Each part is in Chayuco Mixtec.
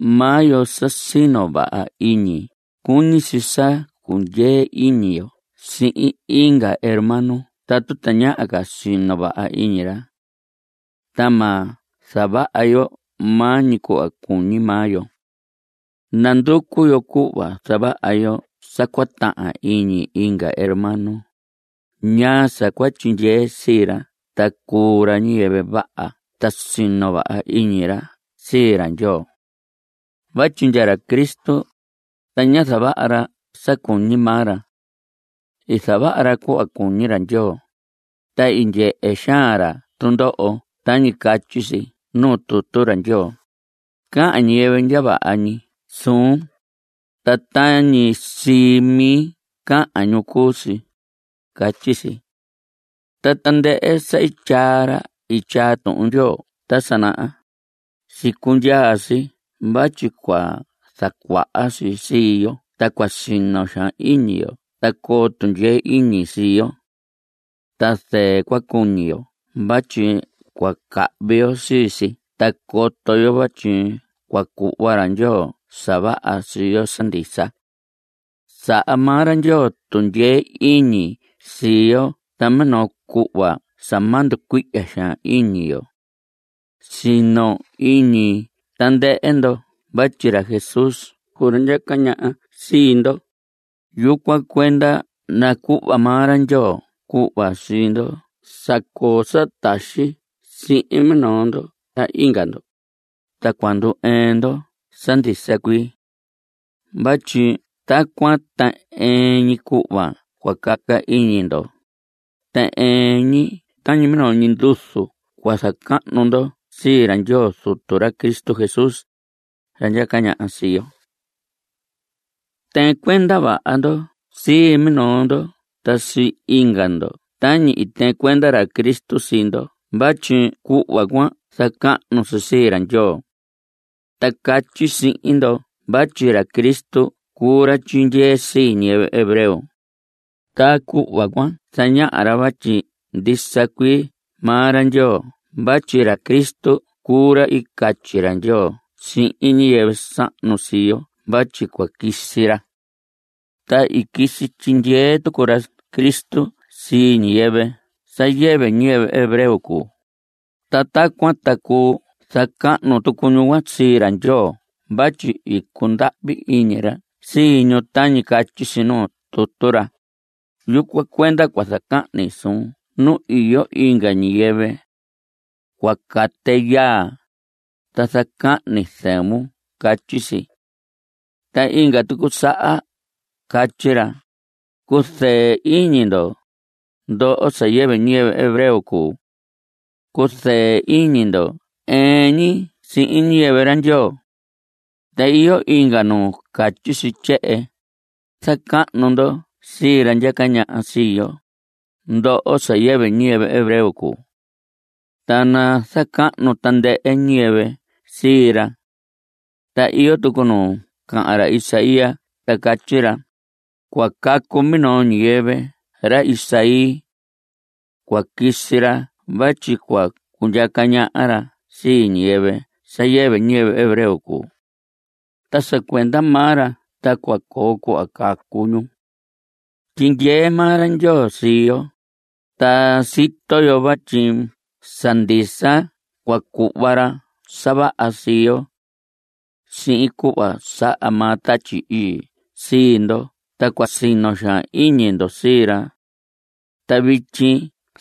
Maa yo sa sino vaha iñi, cuñi si sa cundyee iñi yo sihin inga hermano tatu tañaha ca sino vaha iñi ra. Ta ma zavaha yo maa ñi cuhva cuñi maa yo. Nanducu yo cuhva zavaha yo sa cua tahan iñi inga hermano, ñaa sa cua tyindyee sii ra ta cuu ra ñiyɨvɨ vaha ta sino vaha iñi ra sii ra Ndyoo. Vatyi ndya ra Cristo, ta ñá zavaha ra sa cuñi maa ra. I zavaha ra cuhva cuñi ra Ndyoo. Ta i ndyehe xaan ra tundoho tañi catyi si nuu tutu ra Ndyoo: “Cahan ñiyɨvɨ ndya vaha ñi suun, ta tañi sii mi cahan ñu cuu si”, catyi si. Ta tandɨhɨ sa i tyaa ra tyaa Tuhun Ndyoo ta sa naha, i sicundyaa si vatyi cua zacuaha si sii yo ta cua sino xaan iñi yo ta coo tundyee iñi sii yo. Ta zɨɨ cua cuñi yo vatyi cua cahvi yo sii si ta coto yo vatyi cua cuhva ra Ndyoo sa vaha sii yo sa ndisa. Saha maa ra Ndyoo tundyee iñi sii yo ta minoo cuhva sa ma nducuihya xaan iñi yo. Sino iñi tandɨhɨ ndo vatyi ra Jesús cuu ra ndyaca ñaha sii ndo, yucuan cuenda nacuhva maa ra Ndyoo cuhva sii ndo sa coo sa taxi sihin minoo ndo ta inga ndo, ta cua ndu‑ɨɨn ndo sa ndisa cuii. Vatyi tacuan ta ɨɨn ñi cuhva cua caca iñi ndo, ta ɨɨn ñi tañi minoo ñi nduzu cua zacahnu ndo sii ra Ndyoo Zutu ra Cristo Jesús, ra ndyaca ñaha sii yo. Tɨɨn cuenda vaha ndo sii minoo ndo ta sii inga ndo tañi i tɨɨn cuenda ra Cristo sii ndo vatyi cuhva cuan zacahnu si sii ra Ndyoo. Ta catyi sihin ndo vatyi ra Cristo cuu ra tyindyee sii ñiyɨvɨ hebreo, ta cuhva cuan zañaha ra vatyi ndisa cuii maa ra Ndyoo vatyi ra Cristo cuu ra i catyi ra Ndyoo sihin ñiyɨvɨ sahnu sii yo vatyi cua quisi ra. (Ta i quisi tyindyee tucu ra Cristo sii ñiyɨvɨ sa yɨvɨ ñiyɨvɨ hebreo cuu), ta tacuan ta cuu zacahnu tucu ñu cuan sii ra Ndyoo vatyi i cundahvi iñi ra sii ñu tañi catyi si nuu tutu ra: Yucuan cuenda cua zacahni suun nu iyo inga ñiyɨvɨ. Cua cate yaa, ta zacahni zɨvun. Catyi si. Ta inga tucu saha catyi ra: Cuzɨɨ iñi ndo, ndoho sa yɨvɨ ñiyɨvɨ hebreo cuu. Cuzɨɨ iñi ndo ɨɨn ñi sihin ñiyɨvɨ ra Ndyoo. Ta iyo inga nu catyi si tyehen: Zacahnu ndo sii ra ndyaca ñaha sii yo, ndoho sa yɨvɨ ñiyɨvɨ hebreo cuu. Ta nazacahnu tandɨhɨ ñiyɨvɨ sii ra. Ta iyo tucu nu cahan ra Isaías ta catyi ra: Cua cacu minoo ñiyɨvɨ ra Isaí. Cua quisi ra vatyi cua cundyaca ñaha ra sii ñiyɨvɨ sa yɨvɨ ñiyɨvɨ hebreo cuu. Ta sa cuenda maa ra ta cua coo cuhva cacu ñu. Tyindyee maa ra Ndyoo sii yo, ta sito yo vatyi sa ndisa cua cuhva ra sa vaha sii yo. Sihin cuhva saha maa Tatyi Ii sii ndo ta cua sino xaan iñi ndo sii ra. Ta vityi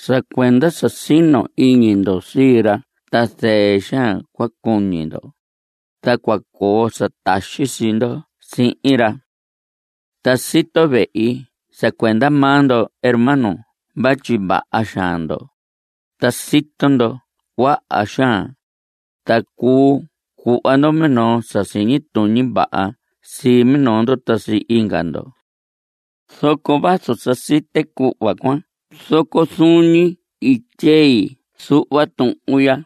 sa cuenda sa sino iñi ndo sii ra ta zɨɨ xaan cua cuñi ndo, ta cua coo sa taxi sii ndo sihin ra. Ta sito vehi sa cuenda maa ndo hermanos vatyi vaha xaan ndo, ta sito ndo cuaha xaan, ta cuu cuhva ndo minoo sa siñi tuñi vaha sii minoo ndo ta sii inga ndo. Zoco vazu sa site cuhva cuan zoco zuun ñi i tyei zuhva tuhun ya,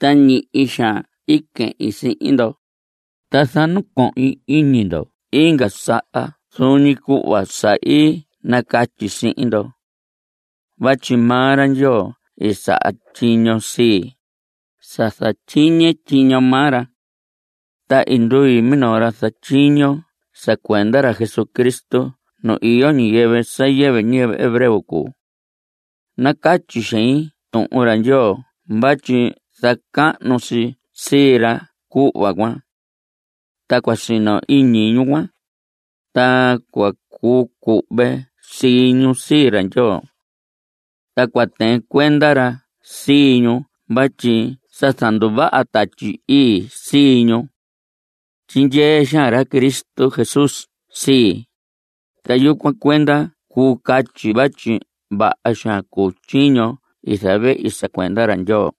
ta ñihi xaan i quehin sihin ndo, ta zanacohin iñi ndo inga saha zuun ñi cuhva sa i nacatyi sihin ndo. Vatyi maa ra Ndyoo i saha tyiño sii, sa zatyiñe tyiño maa ra. Ta i ndui minoo ra zatyiño sa cuenda ra Jesucristo nu iyo ñiyɨvɨ sa yɨvɨ ñiyɨvɨ hebreo cuu. Nacatyi xein Tuhun ra Ndyoo vatyi zacahnu si sii ra cuhva cuan. Ta cua sino iñi ñu cuan, ta cua cuu cuhve sii ñu sii ra Ndyoo. Ta cua tɨɨn cuenda ra sii ñu vatyi sa zanduvaha Tatyi Ii sii ñu. Tyindyee xaan ra Cristo Jesús sii, ta yucuan cuenda cuu catyi vatyi vaha xaan cuu tyiño i zavehi sa cuenda ra Ndyoo.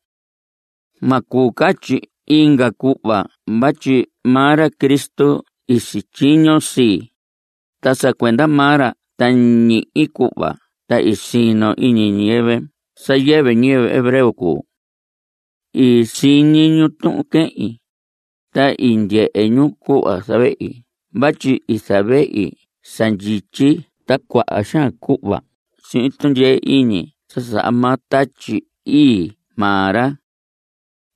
Ma cuu catyi inga cuhva vatyi maa ra Cristo i sityiño sii, ta sa cuenda maa ra ta ñihi cuhva ta i sino iñi ñiyɨvɨ sa yɨvɨ ñiyɨvɨ hebreo cuu. I siñi ñu tuhun quehin, ta i ndyehe ñu cuhva zavehi vatyi i zavehi sa ndyityi ta cuaha xaan cuhva sihin tundyee iñi sa saha maa Tatyi Ii maa ra.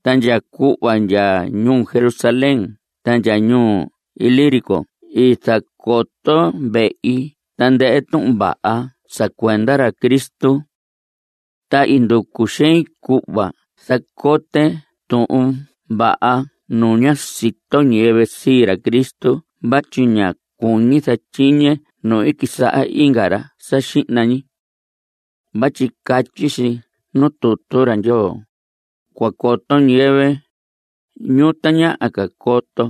Ta ndya cuhva ndya ñuu Jerusalén ta ndya ñuu Ilírico i zacoto vehi tandɨhɨ Tuhun Vaha sa cuenda ra Cristo. Ta i nducu xein cuhva zacote Tuhun Vaha nu ña sito ñiyɨvɨ sii ra Cristo vatyi ña cuñi zatyiñe nu i quisaha inga ra sa xihna ñi. Vatyi catyi si nuu tutu ra Ndyoo: Cua coto ñiyɨvɨ, ñu tañaha ca coto,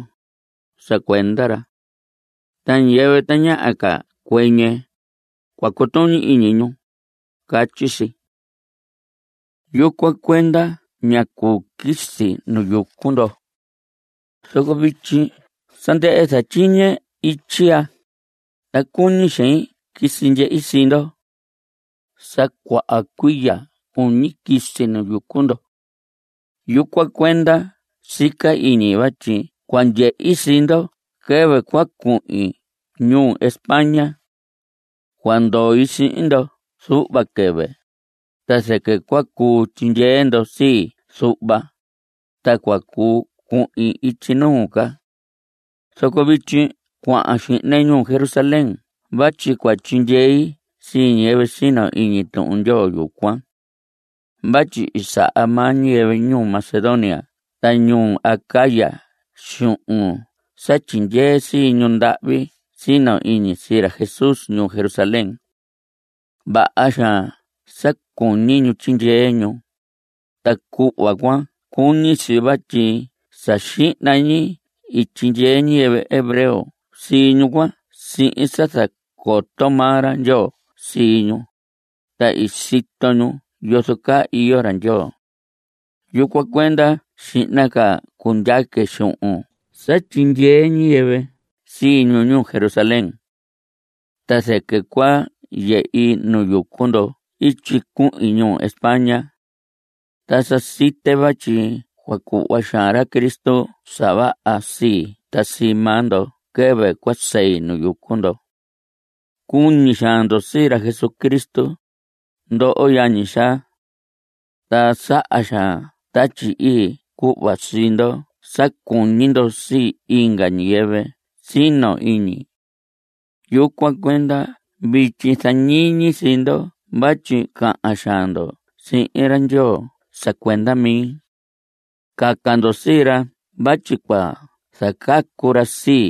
sa cuenda ra. Ta ñiyɨvɨ tañaha ca cuɨñɨ, cua cutuñi iñi ñu, catyi si. Yucuan cuenda ñá cuu quisi nu yucu ndo. Zoco vityi sa ndɨhɨ zatyiñe ityi ya, ta cuñi xein quisi ndyehi sii ndo. Sa cuaha cuiya cuñi quisi nu yucu ndo. Yucuan cuenda sica iñi vatyi cua ndyehi sii ndo quɨvɨ cua cuhin ñuu España. Cua ndoi sihin ndo zuhva quɨvɨ, ta zɨquɨ cua cuu tyindyee ndo sii zuhva, ta cua cuu cuhin ityi nuu ca. Zoco vityi cuahan xihne ñuu Jerusalén vatyi cua tyindyei sii ñiyɨvɨ sino iñi Tuhun Ndyoo yucuan. Vatyi i saha maa ñiyɨvɨ ñuu Macedonia ta ñuu Acaya xuhun sa tyindyee sii ñu ndahvi sino iñi sii ra Jesús ñuu Jerusalén. Vaha xaan sa cuñi ñu tyindyee ñu, ta cuhva cuan cuñi si, vatyi sa xihna ñi i tyindyee ñiyɨvɨ hebreo sii ñu cuan sihin sa zacoto maa ra Ndyoo sii ñu, ta i sito ñu yozo caa iyo ra Ndyoo. Yucuan cuenda xihna ca cundyaque xuhun sa tyindyee ñiyɨvɨ sii ñu ñuu Jerusalén. Ta zɨquɨ cua yehi nu yucu ndo ityi cuhin ñuu España. Ta sa site vatyi cua cuhva xaan ra Cristo sa vaha sii ta sii maa ndo quɨvɨ cua sei nu yucu ndo. Cuñi xaan ndo sii ra Jesucristo, ndoho yañi xaa. Ta saha xaan Tatyi Ii cuhva sii ndo sa cuñi ndo sii inga ñiyɨvɨ sino iñi. Yucuan cuenda vityi zañiñi sii ndo vatyi cahan xaan ndo sihin ra Ndyoo sa cuenda mi. Caca ndo sii ra vatyi cua zacacu ra sii,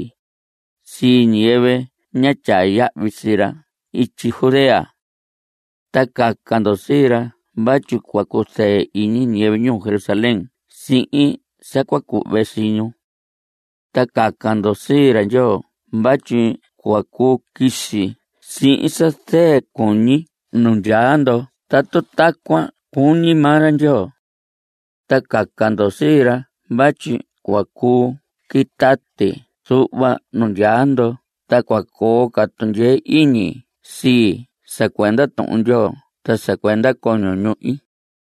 sii ñiyɨvɨ ña tyaa yahvi sii ra ityi Judea. Ta caca ndo sii ra vatyi cua cuzɨɨ iñi ñiyɨvɨ ñuu Jerusalén sihin sa cua cuhve sii ñu. Ta caca ndo sii ra Ndyoo vatyi cua cuu quisi sihin sa zɨɨ cuñi nu ndyaa ndo tatu tacuan cuñi maa ra Ndyoo. Ta caca ndo sii ra vatyi cua cuu quitati zuhva nu ndyaa ndo ta cua coo ca tundyee iñi sii sa cuenda Tuhun Ndyoo ta sa cuenda coño ñuhi.